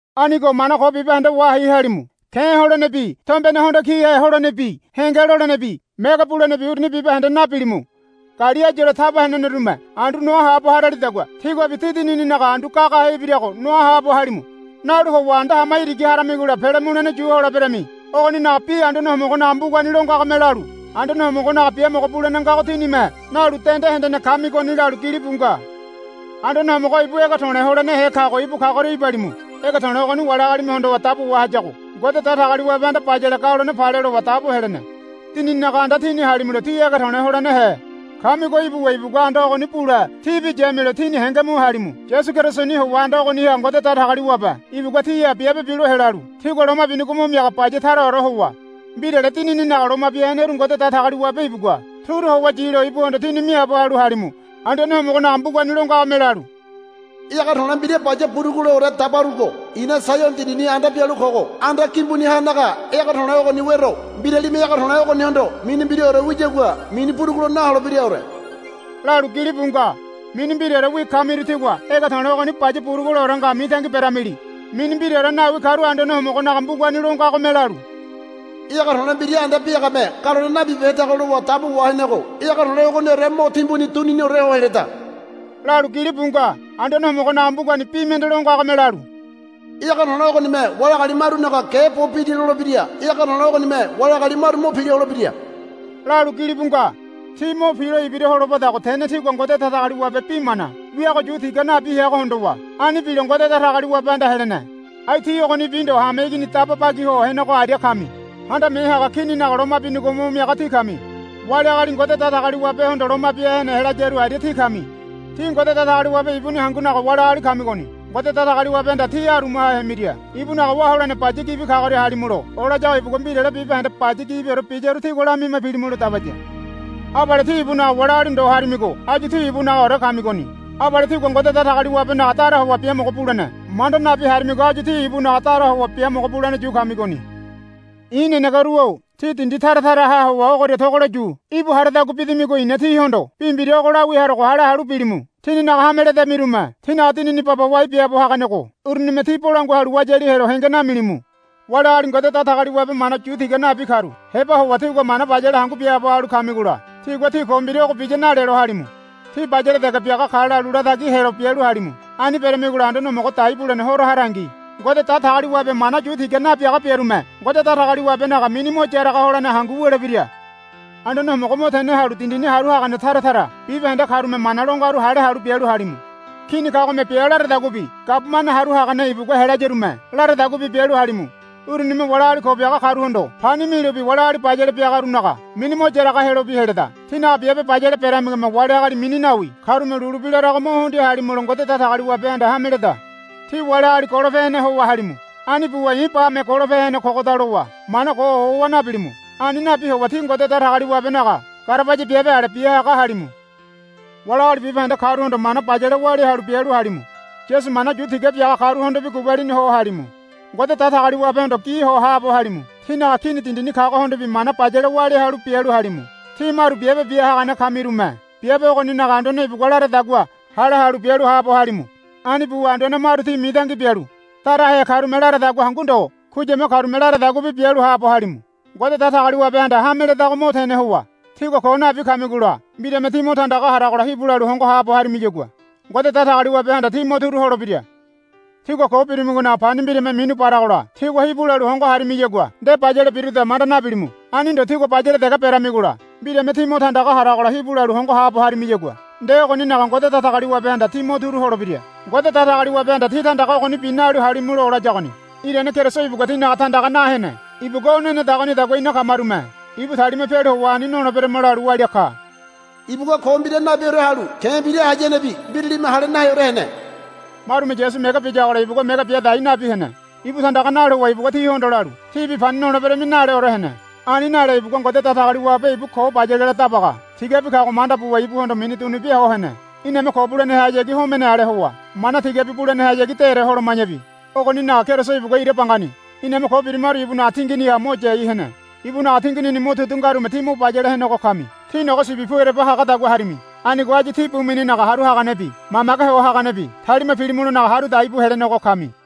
Anigo mana ko bibahende wahai halimu. Ke̱ holenebi tombene hondo kihe holenebi henge lolenebi mege bulenebi uruni bibahende nabilimu. Gali áyuore taba henenerume andu noa haabo haralidagua tíguabi tí dinininaga andu gagahe ibirago noa haabo halimu. Nalu howa anda hama irigi haramigola pele mulene yu holeberami. Ogoninaga bi Anduane Homogonaga mbugani lo ngagome lalu, Anduane Homogonaga biamogo bulene ngago tínime nalu dende hendene kamigoni, lalu gilibu nga. Anduane Homogo ibu ege to̱le̱ holenehe kago ibu kagoria ibalimu. Ege to̱le̱ ogoni wali agalime hondowa dabo wahayago Ngode Datagaliwabehanda, Bayale galone pale, lowa dabo helene. Dinininaga anda tíni halimulo tí ege to̱le̱ holenehe kamigo ibuwa ibugua anda ogoni bule tíbi yamilo tíni henge mu halimu. Yasu Kerisoni howa anda ogoniha Ngode Datagaliwabe ibugua tíha biabe bilo helalu tígua loma binigo mo miaga baya taraore howa mbirale Dinininaga loma bia heneru Ngode Datagaliwabe ibugua turu howa yilo ibuhondo tíni miaabo halu halimu. Anduane Homogonaga mbugani lo ngagome lalu, Ege to̱le̱ mbira baya buruguleore dabarugo i̱na Saiono dindini anda bialu kogo anda gimbunihanaga ege to̱le̱ ogoni wero. Mbiralime ege to̱le̱ ogonihondo mini mbiraore wiyagua mini burugulo naholebiraore, lalu gilibu nga. Mini mbiraorewi kamiru tígua ege to̱le̱ ogoni baya buruguleore nga mitangi beramili. Mini mbiraore nawi karu Anduane Homogonaga mbugani lo ngagome lalu, Ege to̱le̱ mbira anda biagame galone nabibehedago lowa dabo wahenego ege to̱le̱ ogoniore mo timbuni duniniore ho heleda, lalu gilibu nga. Anduane Homogonaga mbugani bi mende lo ngagome lalu, Ege to̱le̱ ogonime wali agali marunaga ge bo bidi lolebira. Ege to̱le̱ ogonime wali agali maru mo pila holebira, lalu gilibu nga. Ti mo pilo ibira holobadago tene tigua Ngode Datagaliwabe bi mana wiago yu tiga nabi heago hondowa ani bilo Ngode Datagaliwabehanda helene. Ai tí ogonibi ndo hameigini daba bagi ho henego aria kami. Handame Haga Kininaga loma binigo mo miaga tí kami. Wali agali Ngode Datagaliwabehondo loma bia hene helayaru aria tí kami. Tí Ngode Datagaliwabe ibuni hangunaga wali agali kamigoni. Ngode Datagaliwabehanda tí arumaha hemiria ibunaga wá holene baya gibi kagoria halimulo olayago ibugua mbirale bibahende baya gibiore biyaru tígua lamima pilimulo dabaya. Abale tí ibunaga wali agali ndo harimigo áyu tí ibunagaore kamigoni. Abale tígua Ngode Datagaliwabenaga dara howa biamogo bulene manda nabi harimigo áyu tí ibunaga dara howa biamogo bulene yu kamigoni. I̱ nenegeru-o tí dindi tara taraha howa ogoria togolo yu íbu haradagua bidamigo i̱na tíhondo bi mbira ogo lawia harogo hale halu bilimu. Tingininaga hame ledamirume tínaga dinini baba wai biaabo haganego urunime tí bolangua halu wayali helo henge namilimu. Wali agali Ngode Datagaliwabe mana yu tiga nabi karu heba howa tígua mana bayale hangu biaabo halu kamigola tigua, Tí ko mbira ogo biya, nalelo halimu. Tí bayale dege biaga ka, lalu latagi helo bialu halimu. Ani beramigola Anduane Homogo dai bulene Horo harangi Ngode Datagaliwabe mana yu tiga nabiaga biarume Ngode Datagaliwabenaga mini mo yaraga holene hangu wulebira. Anduane Homogo mo tene halu dindini haru hagane tara tara bibahende karume mana lo ngaru hale halu bialu halimu. Kini kagome bia laradaguabi gabumane haru hagane ibugua helayarume laradaguabi bialu halimu. Urunime wali agali ko biaga karuhondo pani milobi wali agali bayale biagarunaga mini mo yaraga helobi heleda. Tinaga biabe bayale beramigome wali agali mini nawi karume lulu bi larago mo hundia halimulo Ngode Datagaliwabehanda hame leda. Tí wali agali golope hene howa halimu. Ani buwa, I̱ bame golope hene kogoda, lowa mana ko ohowa nabilimu. Ani nabi howa tí Ngode Datagaliwabenaga garabaya biabe ale bia haga halimu. Wali agali bibahende karuhondo mana bayale walia halu bialu halimu. Yasu mana yu tiga biaga karuhondobi gubalini ho halimu. Ngode Datagaliwabehondo gi ho haabo halimu. Tínaga kini dindini kagohondobi mana bayale walia halu bialu halimu. Tí maru biabe bia hagane kamirume biabe ogoninaga anduane ibugua laradagua hale halu bialu haabo halimu. Ani buwa anduane maru tí mitangi bialu darahe karume laradagua hangu ndo kuyama karume laradaguabi bialu haabo halimu. Ngode Datagaliwabehanda hame ledago mo tene howa tígua ko nabi kamigola mbirame tí mo tandaga haragola hibu lalu hongo haabo harimiyagua Ngode Datagaliwabehanda tí mo turu holebira. Tígua ko birimigonaga pani mbirame minu baragola tígua hibu lalu hongo harimiyagua nde bayale biruda manda nabilimu. Ani ndo tígua bayale dege beramigola mbirame tí mo tandaga haragola hibu lalu hongo haabo harimiyagua nde ogoninaga Ngode Datagaliwabehanda tí mo turu holebira. Ngode Datagaliwabehanda tí tandaga ogonibi nalu halimulo olayagoni. Irane Keriso ibugua tínaga tandaga na hene. Ibugua o nenedagonidagua ina kamarume ibu talima pialu howa ani noleberama lalu walia ka. Ibugua ko mbira nabiore halu ke̱ mbira hayanebi mbiralime hale naheore hene. Marume Yasu mege biyagola ibugua mege bia dai nabi hene. Ibu tandaga nalu howa ibugua tihondo lalu, Tíbi pani noleberami, naleore hene. Ani nale ibugua Ngode Datagaliwabe ibu ko bayalela Dabaga tigabi kago manda buwa ibuhondo mini dunubia ho hene. Iname ko bulenehayagi homene ale howa mana tigabi bulenehayagi dére holoma̱yabi ogoninaga Keriso ibugua ira bangani iname ko birimaru ibunaga tinginiha mo yai hene. Ibunaga tinginini motudu ngarume tí mo bayale henego kami. Tí nogo sibi pu ereba hagadagua harimi. Anigo áyu tí bu mininaga Haru Haganebi Mamage Ho Haganebi talima pilimulonaga haru dai bu helenego kami.